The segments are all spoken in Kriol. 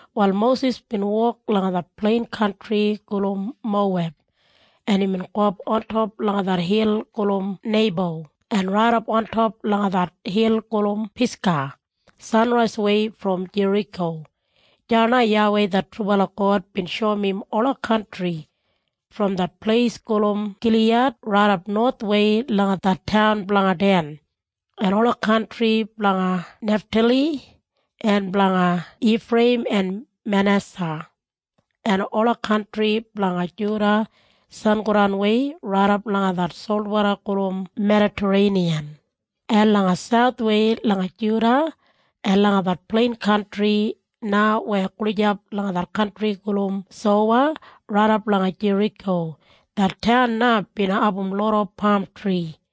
Wal Mosis bin wok langa det plein kantri gulum Moweb en imbin gowap ontop langa det hil gulum Neibo en raidap ontop langa det hil gulum Pisga, sanraiswei brom Jeriko. Deya na YAWEI det trubala God bin shoum im ola kantri, brom det pleis gulum Giliyad raidap nowathwei langa det taun blanga Den, en ola kantri blanga Neftali, en blanga Ifreiyim en Manesa, en ola kantri blanga Juda sangodanwei raidap langa det solwoda gulum Medatareiniyan, en langa sauthwei langa Juda, en langa det plein kantri na weya gulijap langa det kantri gulum Sowa raidap langa Jeriko. Det taun na bin abum loda pamtri.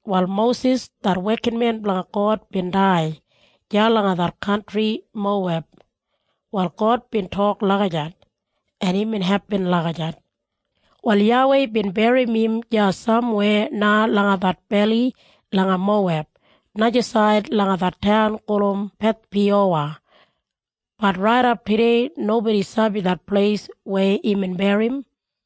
Wal Mosis, det wekinmen blanga God bin dai deya langa det kantri Moweb. Wal God bin tok lagijat, en imbin hepin lagijat. Wal YAWEI bin berrim im deya samweya na langa det beli langa Moweb, najasaid langa det taun gulum Bethpiyowa, bat raidap tudei nobodi sabi det pleis weya imbin berrim im.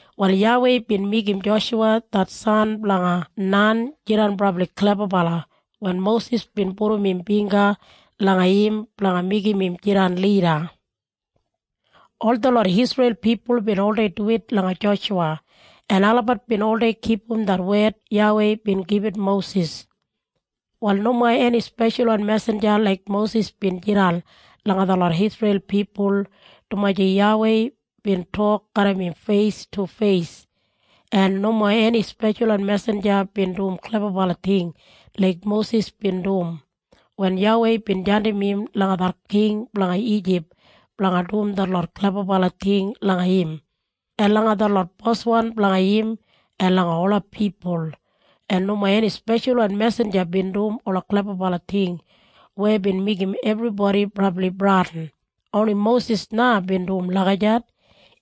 Wal YAWEI bin meigim Joshuwa det san blanga Nan jidan brabli klebabala wen Mosis bin pudum im bingga langa im blanga meigim im jidan lida. Ol detlot Isreil pipul bin oldei duwit langa Joshuwa en olabat bin oldei kipum det wed YAWEI bin gibit Mosis. Wal nomo eni speshalwan mesinja laik Mosis bin jidan langa detlot Isreil pipul dumaji YAWEI bin tok garram im feis tu feis. En nomo eni speshalwan mesinja bin dum klebabala ting laik Mosis bin dum wen YAWEI bin jandim im langa det king blanga Ijip blanga dum detlot klebabala ting langa im, en langa detlot boswan blanga im, en langa ola pipul. En nomo eni speshalwan mesinja bin dum ola klebabala ting weya bin meigim ebribodi brabli bradin. Oni Mosis na bin dum lagijat.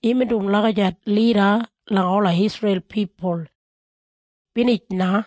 Imbin dum lagijat lida langa ola Isreil pipul. Binij na.